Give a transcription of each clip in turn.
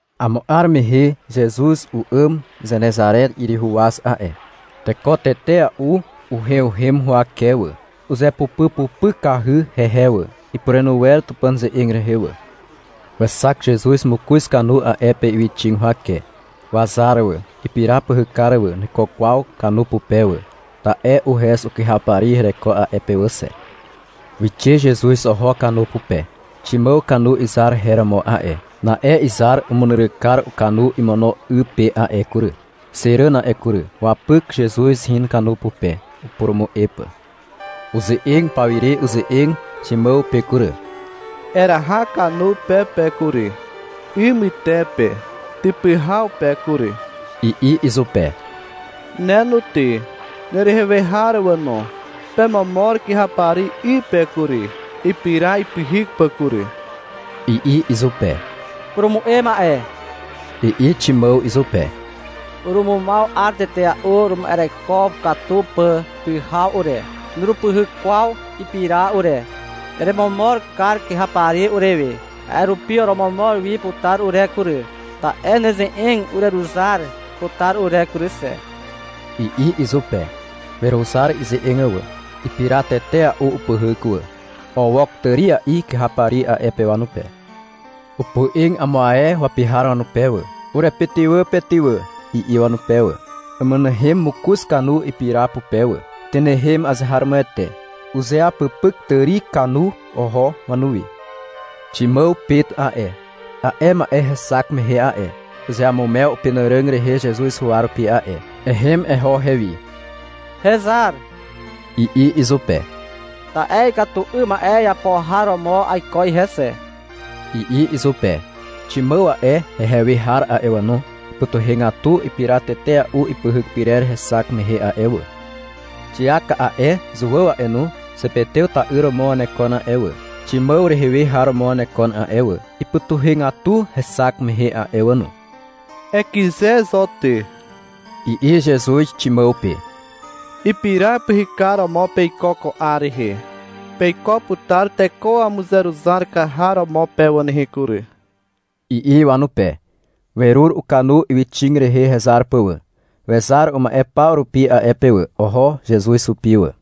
Amo 'ar mehe Zezuz u'àm Zenezare 'yryhu waz a'e. Teko tetea'u uheuhem huwake wà. Uzepupypupykahy hehe wà. Ipurenu wer Tupàn ze'eg rehe wà. Wexak Zezuz mokoz kanu a'e pe ywyxig huwake. Wazar wà, ipira pyhykar wà, nuiko kwaw kanu pupe wà, ta'e uhez ukyhapari hereko a'e pe wà xe. Wixe Zezuz oho kanu pupe. Ximàw kanu izar her romo a'e. Na'e izar umunyryk kar ukanu imono 'y pe a'e kury, xe ràn a'e kury. Wapyk Zezuz in kanu pupe, upurumu'e pà. Uze'eg pawire uze'eg Ximàw pe kury. — Eraha kanu pe pe kury, 'y mytepe typy haw pe kury, i'i izupe. — Ne no ty, nerehe we har wà no, pemomor kyhapari 'y pe kury, ipira ipyhyk pà kury, i'i izupe. — Purumu'e ma'e, i'i Ximàw izupe. — Urumumaw 'ar tetea'u urema'ereko katu pà pyhaw ure, nurupyhyk kwaw ipira ure. Eremomor kar kyhapari urewe, a'e rupi oromomor wi putar ure kury, ta'e neze'eg ureruzar putar ure kury xe, i'i izupe. Weruzar ize'eg wà. Ipira tetea'u upyhyk wà. Owok tària'i kyhapari a'e pe wanupe. Opoe'eg amo ae wapi har wanupe wà. — Urepytywà pe ty wà, i'i wanupe wà. Umynehem mokoz kanu ipira pupe wà. Tynehem azeharomoete. Uzeapypyk tàri kanu oho wanuwi. Ximàw Pet a'e, a'e ma'e hexak mehe a'e, uzeamumew upenàràg rehe Zezuz huwa rupi a'e. — Ehem eho hewi, hezar, i'i izupe. — Ta'e ikatu 'ym ma'e iapo har romo aiko ihe xe, i'i izupe. Ximàw a'e, hehe we har a'e wà no, ipytuhegatu ipira tetea'u ipyhyk pyrer hexak mehe a'e wà. Xiak a'e, Zuàw a'e no, Zepetew ta'yr romo wanekon a'e wà, Ximàw rehe we har romo wanekon a'e wà. Ipytuhegatu hexak mehe a'e wà no. — Ekyze zo ty, i'i Zezuz Ximàw pe. — Ipira pyhykar romo peiko ko 'ar rehe. Peiko putar teko wamuzeruzar kar har romo pe wà nehe kury, i'i wanupe. Werur ukanu ywyxig rehe hezar pà wà. Wezar uma'e paw rupi a'e pe wà. Oho Zezuz hupi wà.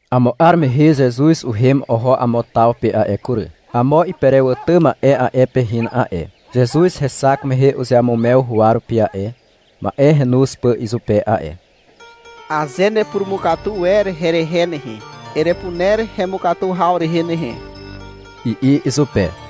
Amo 'ar mehe Zezuz uhem oho amo taw pe a'e kury. Amo iperewàtà ma'e a'e pe hin a'e. Zezuz hexak mehe uzeamumew huwa rupi a'e, ma'e renoz pà izupe a'e. — Aze nepurumukatu wer herehe nehe, erepuner hemukatu haw rehe nehe, i'i izupe.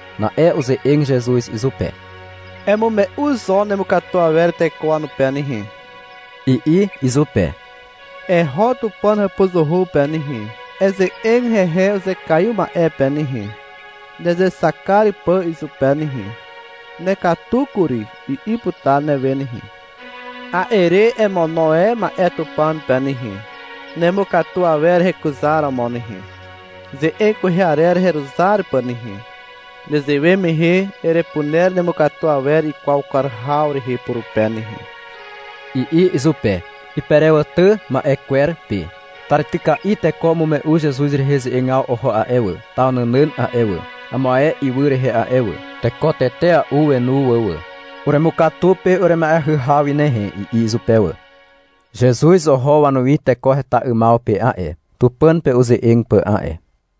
Na'e uze'eg Zezuz izupe. — Emume'u zo nemukatu awer teko wanupe nehe, i'i izupe. — Eho Tupàn hàpuzuhu pe nehe, eze'eg hehe uzekaiw ma'e pe nehe, nezexak kar pà izupe nehe. — Nekatu kury, i'i putar newe nehe. A'e re emono e ma'e Tupàn pe nehe, nemukatu awer hekuzaromo nehe, ze'eg kwehe arer heruzar pà nehe. Nezewe mehe erepuner nemukatu awer ikwaw kar haw rehe purupe nehe, i'i izupe, iperewàtà ma'e kwer pe. Tàrityka'i teko umume'u Zezuz rehe ze'egaw oho a'e wà, taw nànàn a'e wà, amo ae ywy rehe a'e wà. Teko tetea'u wenu wà wà. — Uremukatu pe urema'eahy haw wi nehe, i'i izupe wà. Zezuz oho wanuwi teko heta 'ymaw pe a'e, Tupàn pe uze'eg pà a'e.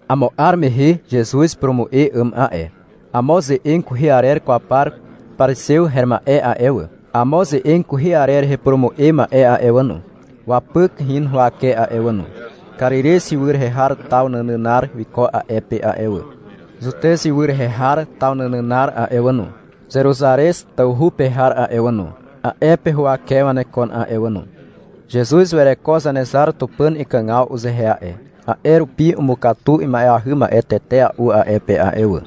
Amo 'ar mehe Zezuz upurumu'e 'àm a'e. Amo ze'eg kwehe arer kwaw par parizew her ma'e a'e wà, amo ze'eg kwehe arer rehe upurumu'e ma'e a'e wà no, wapyk in huwake a'e wà no. Karirez ywy rehe har taw nànànar wiko a'e pe a'e wà. Zutez ywy rehe har taw nànànar a'e wà no, Zeruzarez tawhu pe har a'e wà no, a'e pe huwake wanekon a'e wà no. Zezuz wereko Zanezar Tupàn ikàgaw uzehe a'e, a'e rupi umukatu ima'eahy ma'e tetea'u a'e pe a'e wà.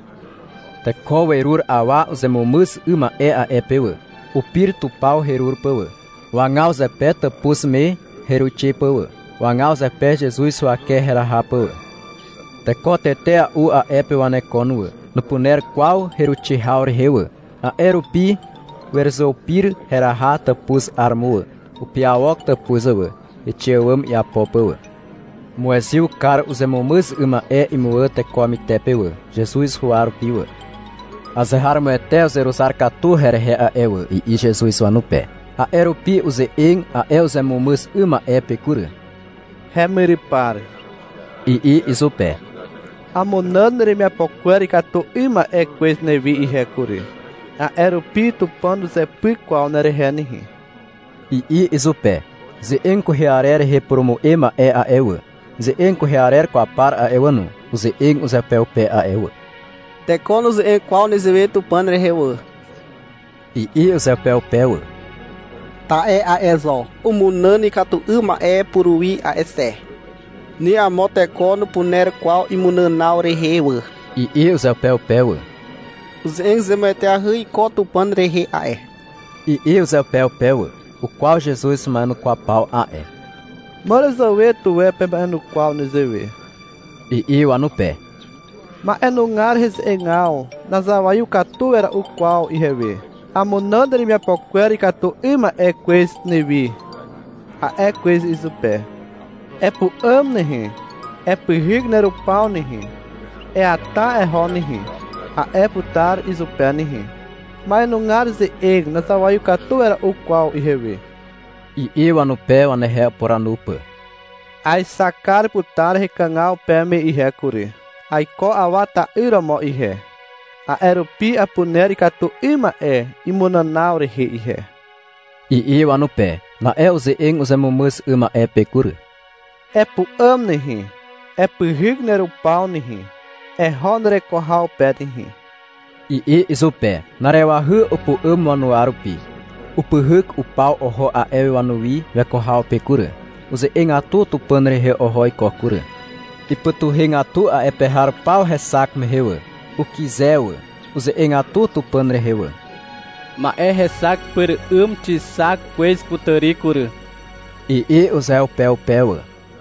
Teko werur awa uzemumyz 'ym ma'e a'e pe wà. Upir tupaw herur pà wà. Wagaw zepe tàpuz me heruixe pà wà. Wagaw zepe Zezuz huwake heraha pà wà. Teko tetea'u a'e pe wanekon wà. Nupuner kwaw heruixe haw rehe wà, a'e rupi weruzeupir heraha tàpuz 'aromo wà. Upiawok tàpuz wà, heixe àwàm iapo pà wà. Umuezyw kar uzemumyz 'ym ma'e imuwà teko wamytepe wà, Zezuz huwa rupi wà. — Azeharomoete uzeruzar katu herehe a'e wà, i'i Zezuz wanupe. A'e rupi uze'eg a'e uzemumyz 'ym ma'e pe kury. — Hemyrypar, i'i izupe. — Amunàn neremiapo kwer ikatu 'ym ma'e kwez newi ihe kury, a'e rupi Tupàn nuzepyk kwaw nerehe nehe, i'i izupe. Ze'eg kwehe arer rehe upurumu'e ma'e a'e wà, ze'eg kwehe arer kwaw par a'e wà no, uze'eg uzeupeupe a'e wà. — Teko nuze'eg kwaw nezewe Tupàn rehe wà, i'i uzeupeupe wà. — Ta'e a'e zo umunàn ikatu 'ym ma'e puruwi a'e xe, ni amo teko nupuner kwaw imunànaw rehe wà, i'i uzeupeupe wà. — Uze'eg zemueteahy iko Tupàn rehe a'e, i'i uzeupeupe wà. Ukwaw Zezuz wama'enukwaw paw a'e. — Màràzàwe tuwe pema'enukwaw nezewe, i'i wanupe. — Ma'enugar heze'egaw nazawaiw katu wera'u kwaw ihewe. — Amunàn neremiapo kwer ikatu 'ym ma'e kwez newi, a'e kwez izupe. — Epu'àm nehe, epyhyk nerupaw nehe, eata eho nehe, a'e putar izupe nehe. Ma'enugar ze'eg nazawaiw katu wera'u kwaw ihewe, i'i wanupe, wanehe upuranu pà. — Aexak kar putar hekàgaw peme ihe kury. Aiko Awa ta'yr romo ihe. A'e rupi apuner ikatu 'ym ma'e imunànaw rehe ihe, i'i wanupe. Na'e uze'eg uzemumyz 'ym ma'e pe kury. — Epu'àm nehe, epyhyk nerupaw nehe, eho nereko haw pe nehe, i'i izupe. Na'arewahy upu'àm wanuwa rupi. Upyhyk upaw oho a'e wi wanuwi weko haw pe kury. Uze'egatu Tupàn rehe oho iko kury. Ipytuhegatu a'e pe har paw hexak mehe wà. Ukyze wà. Uze'egatu Tupàn rehe wà. — Ma'e hexak pyr 'ym xixak kwez kutàri kury, i'i uzeupeupe wà.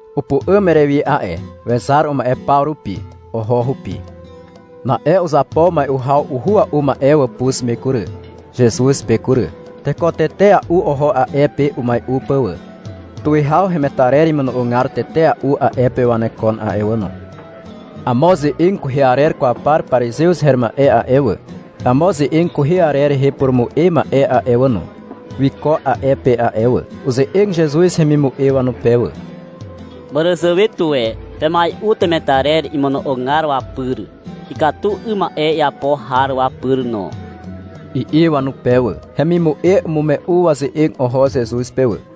Upu'àm Erewi a'e. Wezar uma'e paw rupi. Oho hupi. Na'e uzapo mai'u haw uhua'u ma'e wàpuz me kury, Zezuz pe kury. Teko tetea'u oho a'e pe umai'u pà wà. Tuwihaw hemetarer imono'ogar tetea'u a'e pe wanekon a'e wà no. Amo ze'eg kwehe arer kwaw par parizew her ma'e a'e wà, amo ze'eg kwehe arer rehe upurumu'e ma'e a'e wà no, wiko a'e pe a'e wà. Uze'eg Zezuz hemimu'e wanupe wà. Màràzàwe tuwe pemai'u temetarer imono'ogar wapyr, ikatu 'ym ma'e iapo har wapyr no, i'i wanupe wà. (Hemimu'e umume'u waze'eg oho Zezuz pe wà.)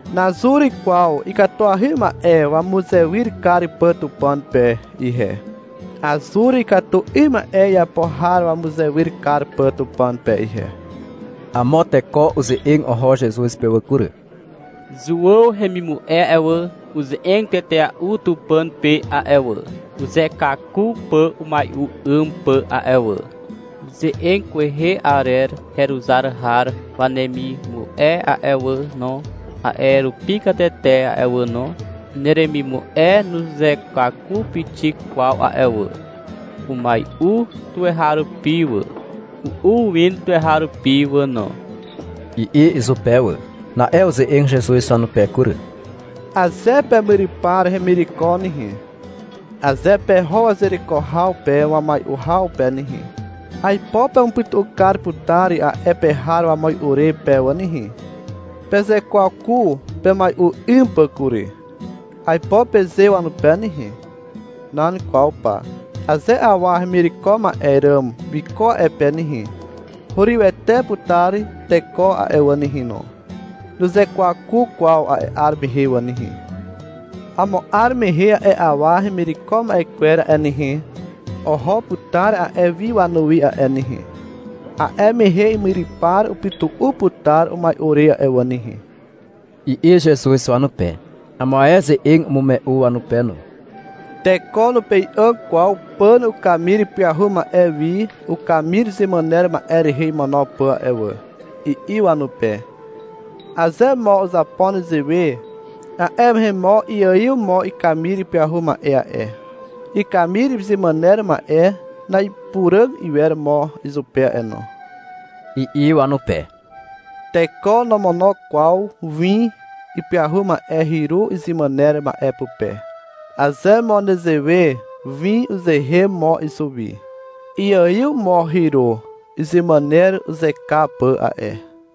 Nazur kwaw ikatuahy ma'e wamuzewyr kar pà Tupàn pe ihe. Azur ikatu 'ym ma'e iapo har wamuzewyr kar pà Tupàn pe ihe. Amo teko uze'eg oho Zezuz pe wà kury. Zuàw hemimu'e a'e wà, uze'eg tetea'u Tupàn pe a'e wà, uzekwaku pà umai'u 'ym pà a'e wà. Ze'eg kwehe arer heruzar har wanemimu'e a'e wà no, a'e rupi katete a'e wà no. Neremimu'e nuzekwaku pixik kwaw a'e wà. Umai'u tuweharupi wà, u'u win tuweharupi wà no, i'i izupe wà. Na'e uze'eg Zezuz wanupe kury. — Aze pemyrypar hemireko nehe, aze peho wazereko haw pe wamai'u haw pe nehe, aipo pemupytu'u kar putar a'e pe har wamai'u re pe wà nehe. — Pezekwaku pemai'u 'ym pà kury, aipo peze wanupe nehe. Nan kwaw pa. Aze awa hemireko ma'e ràm wiko a'e pe nehe, hurywete putar teko a'e wà nehe no. Nuzekwaku kwaw a'e 'ar mehe wà nehe. Amo 'ar mehe a'e awa hemireko ma'e kwer a'e nehe, oho putar a'e wi wanuwi a'e nehe. A'e mehe imyrypar upytu'u putar umai'u re a'e wà nehe, i'i Zezuz wanupe. Amo ae ze'eg umume'u wanupe no. — Teko nupei'àg kwaw pàn ukamir ipyahu ma'e wi ukamir izemàner ma'e rehe imono pà a'e wà, i'i wanupe. — Aze mo uzapo nezewe, a'e mehe mo iaiw mo ikamir ipyahu ma'e a'e, ikamir izemàner ma'e na'ipuràg iwer mo izupe a'e no, i'i wanupe. Teko nomono kwaw win ipyahu ma'e hyru izemàner ma'e pupe. Aze mo nezewe, win uzeen mo izuwi, iaiw mo hyru izemàner uzeka pà a'e.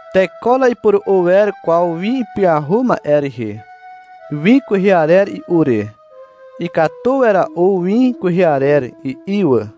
Teko na'ipuru'u wer kwaw win ipyahu ma'e rehe, win kwehe arer i'u re. — Ikatu wera'u win kwehe arer, i'i wà.